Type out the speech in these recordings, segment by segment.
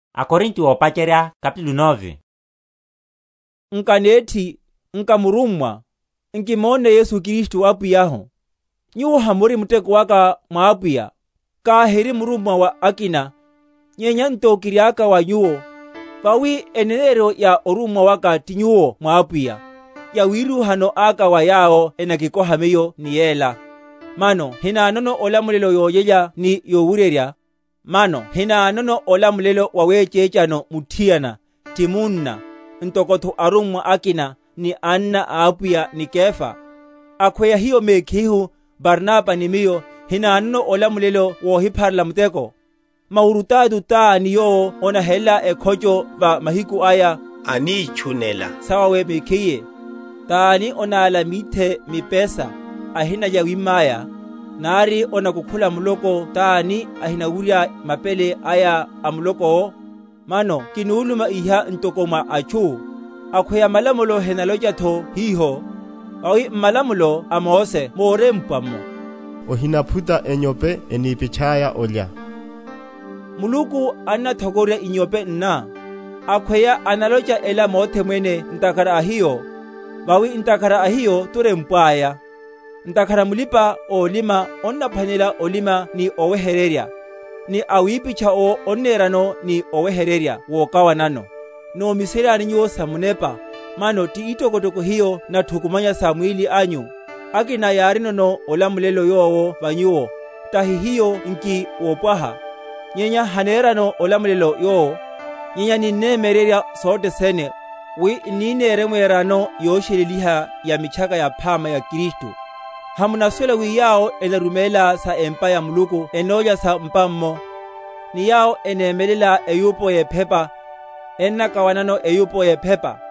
Olamulelo wa murummwa owo. Nka nethi? Nka murummwa? Nkimónne Yesu Apwiyahu? Nyuwo hamuri muteko aka mwa Apwiya? Kahiri murummwa wa akina, nyenya nto kiriaka wa nyuwo; vawi eneneryo ya orummwa waka ti nyuwo mwa Apwiya. Yawirúhano aka wa yawo enakikoha miyo ni yela. Mano hinanono olamulelo wolyelya ni wowuryerya? Mano hinanono olamulelo waweché?-?chano muthiana, ti munna, ntokotho arummwa akina, ni anna a Apwiya, ni Kefa? Akhweya hiyo mekhihu, Barnaba ni miyo, hinanono olamulelo wohipharela muteko? Maurutato tani yowo onahela ekhocho, va mahiku aya, anítchunela sawawe mekhiye? Tani onála mithe mipesa, ahinalya yawimma aya? Nari onakukhula muloko tani, ahinawurya mapele aya a muloko’wo? Mano kinuluma iha ntoko mwa atchu? Akhweya malamulo henalochatho hiho? Vawi m’malamulo a Mose morempwa’mo, Ohinaphuta enyope enípitchaya olya. Muluku annathokororya inyope nna? Akhweya analocha ela mothe mwene ntakhara a hiyo? Vawi, ntakhara a hiyo turempwaya; ntakhara mulipa‐olima onnaphwanela olima ni oweheryerya, ni awipitcha owo onnerano ni oweheryerya wokawanano. Nomiseryani nyuwo sa munepa, mano ti itokotoko hiyo nathukumanya sa mwíli anyu? Akina yarinono olamulelo yowo va nyuwo, tahi hiyo nki wopwaha? Nyenya hanenreno olamulelo yowo; nyenya ninnemyeryerya sothe sene, wi n’ni neremwerano yosheleliha ya Mitchaka Yaphama ya Kristu. Hamunasuwela wi yawo enaruméla sa empa ya Muluku ennólya sa m’pa’mmo, ni yawo enémelela eyupo yephepa, ennakawanano eyupo yephepa?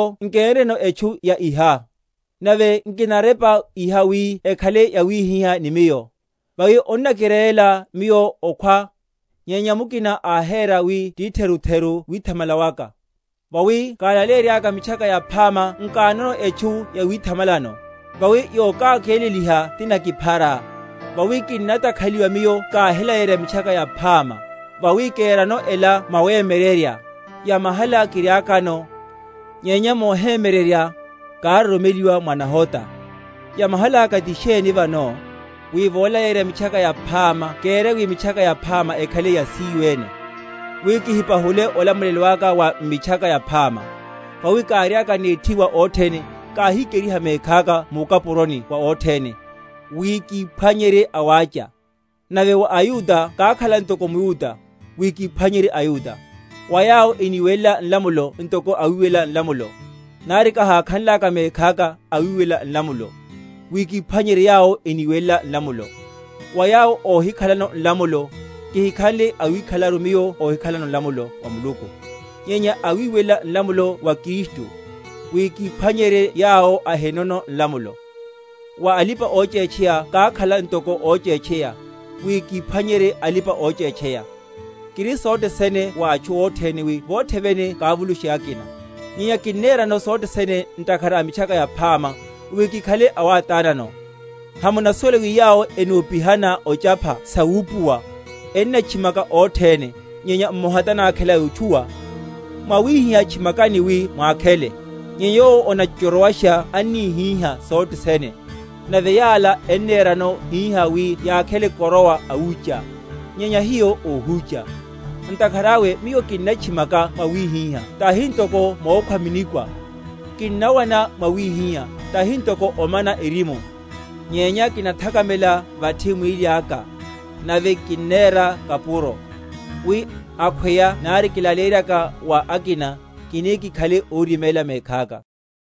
Nyenya miyo nkénreno etchu ya iha; nave nkinarepa iha wi ekhale yawihihá ni miyo; vawi onnakirérela miyo okhwa, nyenya mukina ahere wi titherutheru withamala waka. Vawi kalaleyerya Mitchaka Yaphama nkanono etchu yawithamalano; vawi yokákeleliha tinakiphara; vawi kinnatakhaliwa miyo káhilaleyerya Mitchaka Yaphama. Vawi kerano ela mwawemyeryerya, yamahala kiriakano; nyenya mohemyeryerya, károromeliwa mwa nahota. Yamahaláka ti sheni vano? Wi volaleyerya Mitchaka Yaphama kere wi Mitchaka Yaphama ekhale yasíyo ene, wi kihipahule olamulelo aka wa m’Mitchaka Yaphama. Vawi káriaka nethi wa othene, káhikeriha mekhaka mukapuroni wa othene, wi kíphwanyerye awácha. Nave wa aYuda kákhala ntoko mYuda, wi kíphwanyerye aYuda; wa yawo eniwelela nlamulo ntoko awiwelela nlamulo, nari kahákhanlaka mekhaka awiwelela nlamulo, wi kíphwanyerye yawo eniwelela malamulo; wa yawo óhikhalano nlamulo, kihikhanle awikhalelaru miyo óhikhalano nlamulo wa Muluku, nyenya awiwelela nlamulo wa Kristu, wi kíphwanyerye yawo ahinono nlamulo. Wa alipa‐ochétcheya kákhala ntoko óchétcheya, wi kíphwanyerye alipa‐ochétcheya. Kiri sothe sene wa atchu othene, wi vothe vene kavulushe akina. Nyenya kinnerano sothe sene ntakhara a Mitchaka Yaphama, wi kikhale awátánano. Hamunasuwela wi yawo enopihana ochapha sa wupuwa, ennatchimaka othene, nyenya mmoha tanákhela yotchuwa? Mwawihihá tchimakani, wi mwakhele. Nyenya yowo onachochorowasha anníhíha sothe sene. Nave yala ennerano hihá wi yakhele koroa awúcha; nyenya hiyo óhúcha. Ntakhara awe miyo kinnatchimaka mwawihihá, tahi ntoko mokhwa?-?minikwa. Kinnawana mwawihihá, tahi ntoko omana erimu; nyenya kinathakamela vathi mwíli aka, nave kinnera kapuro; wi, akhweya nari kilaleyenryaka wa akina, kini kikhale óriméla mekhaka.